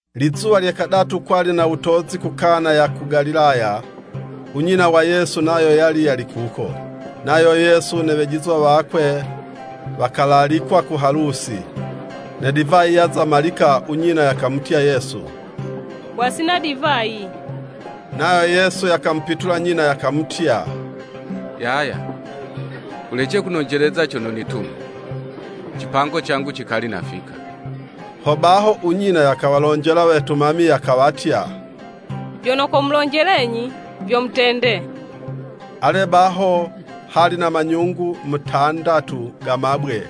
Lizuwa lye kadatu, kwali na wutozi ku Kana ya ku Galilaya; u nyina wa Yesu nayo yali yali kuko, nayo Yesu ne wejizwa wakwe wakalalikwa ku halusi. Ne divayi yaza malika, u nyina yakamutya Yesu, “Wasina divayi.” Nayo Yesu yakamupitula nyina yakamutya, “Yaya wulece kunonjeleza cono nitume. Cipango cangu cikali nafika.” Hobaho u nyina, yakawalonjela wetumami yakawatya, “Vyono komulonjelenyi, vyo mutende.” Ale, baho hali na manyungu mutandatu ga mabwe,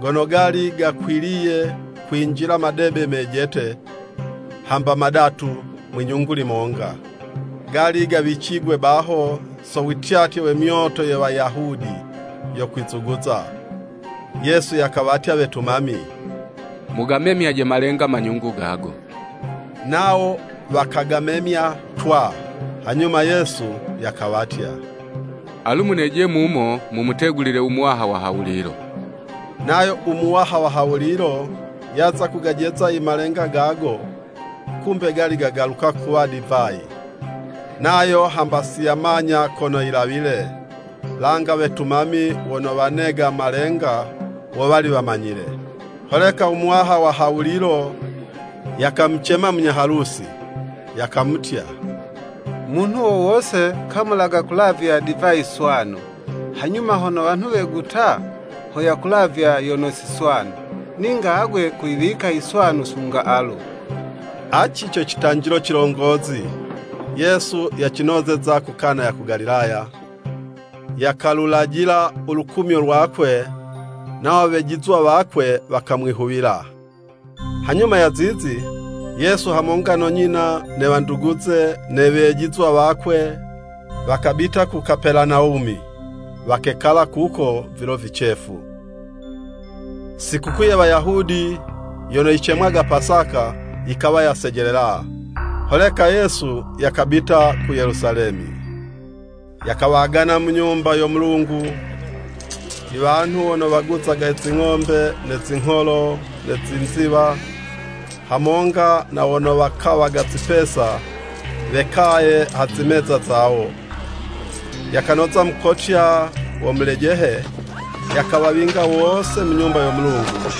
gono gali gakwiliye kwinjila madebe mejete, hamba madatu mwi'nyungu limonga. Gali gawicigwe baho, so wityatye we myoto ye Wayahudi yo kwizuguza. Yesu yakawatya wetumami, “Mugamemyaje malenga manyungu gago.” Nawo wakagamemya twaa. Hanyuma Yesu yakawatya, “Alu muneje mumo mumutegulile u muwaha wa ha wulilo.” Nayo u muwaha wa ha wulilo, yaza kugajeza i malenga gago, kumbe gali gagaluka kuwa divayi. Nayo hamba si yamanya kono yilawile, langa wetumami wono wanega malenga, wo wali wamanyile. Holeka u muwaha wa ha wulilo, yakamucema munya Halusi, yakamutya, “Munhu wo wose kamulaga kulavya divayi swanu, hanyuma hono wanhu weguta, ho yakulavya yono si swanu. Ninga agwe kuyiwika i swanu sunga alu.” Aci co citanjilo cilongozi, Yesu yacinozeza ku Kana ya ku Galilaya, yakalulajila u lukumyo lwakwe, nawo wejizwa wakwe wakamwihuwila. Hanyuma ya zizi, Yesu hamonga no nyina, ne wanduguze, ne wejizwa wakwe, wakabita ku Kapelanawumi, wakekala kuko vilo vicefu. Sikukuu ye Wayahudi yono yicemwaga Pasaka, yikawa yasejelela, holeka Yesu yakabita ku Yelusalemi. Yakawagana mu Nyumba yo Mulungu, iwanhu wono waguzaga zi ng'ombe, ne zingholo, ne zi nziwa, hamonga na wono wakawaga zipesa, wekaye ha zimeza zawo. Yakanoza mukotya wa mulejehe, yakawawinga wose mu Nyumba yo Mulungu,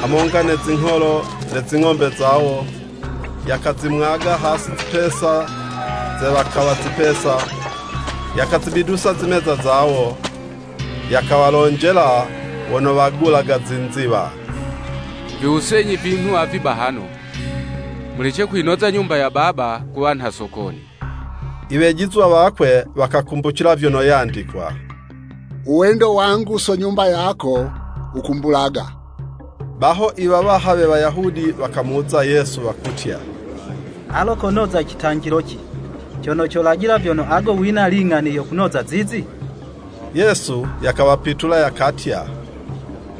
hamonga ne zingholo, ne zing'ombe zawo, yakazimwaga hasi zipesa ze wakawa zipesa, yakazibidusa zimeza zawo. Yakawalonjela wono wagulaga zinziwa, “Viwusenyi vinhu avi bahano, mulece kuyinoza Nyumba ya Baba kuwa nha sokoni.” Iwejizwa wakwe wakakumbucila vyono yandikwa, “Uwendo wangu so Nyumba yako, wukumbulaga.” Baho iwawaha we Wayahudi wakamuwuza Yesu wakutya, “Alo konoza citanjiloci, cono colajila vyono agwe wina ling'ani yo kunoza zizi?” Yesu yakawapitula yakatya,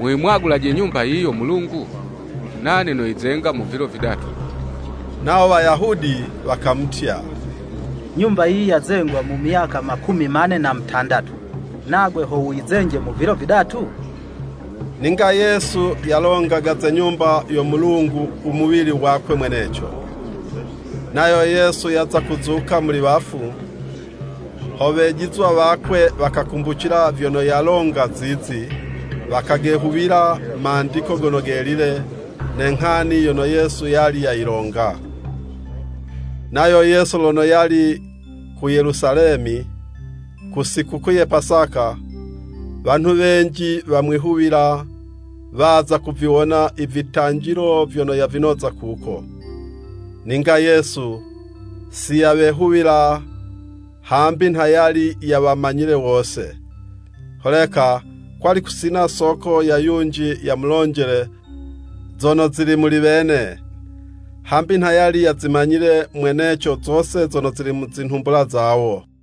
“Muyimwagulaje Nyumba yiyi yo Mulungu, nane noyizenga mu vilo vidatu.” Nawo Wayahudi wakamutya, “Nyumba yiyi yazengwa mu myaka makumi mane na mutandatu, nagwe ho wuyizenje mu vilo vidatu?” Ninga Yesu yalongaga ze Nyumba yo Mulungu u muwili wakwe mweneco. Nayo Yesu yaza kuzuka muli wafu, ho wejizwa wakwe wakakumbucila vyono yalonga zizi, wakagehuwila Mandiko Gono Gelile, ne nghani yono Yesu yali yayilonga. Nayo Yesu, lono yali ku Yelusalemi ku sikukuu ya Pasaka, wanhu wenji wamwihuwila, waza kuviwona ivitanjilo vyono yavinoza kuko. Ninga Yesu si yawehuwila, hambi nha yali yawamanyile wose. Holeka kwali kusina soko ya yunji yamulonjele zono zili muli wene, hambi nha yali yazimanyile mweneco zose zono zili mu zinhumbula zawo.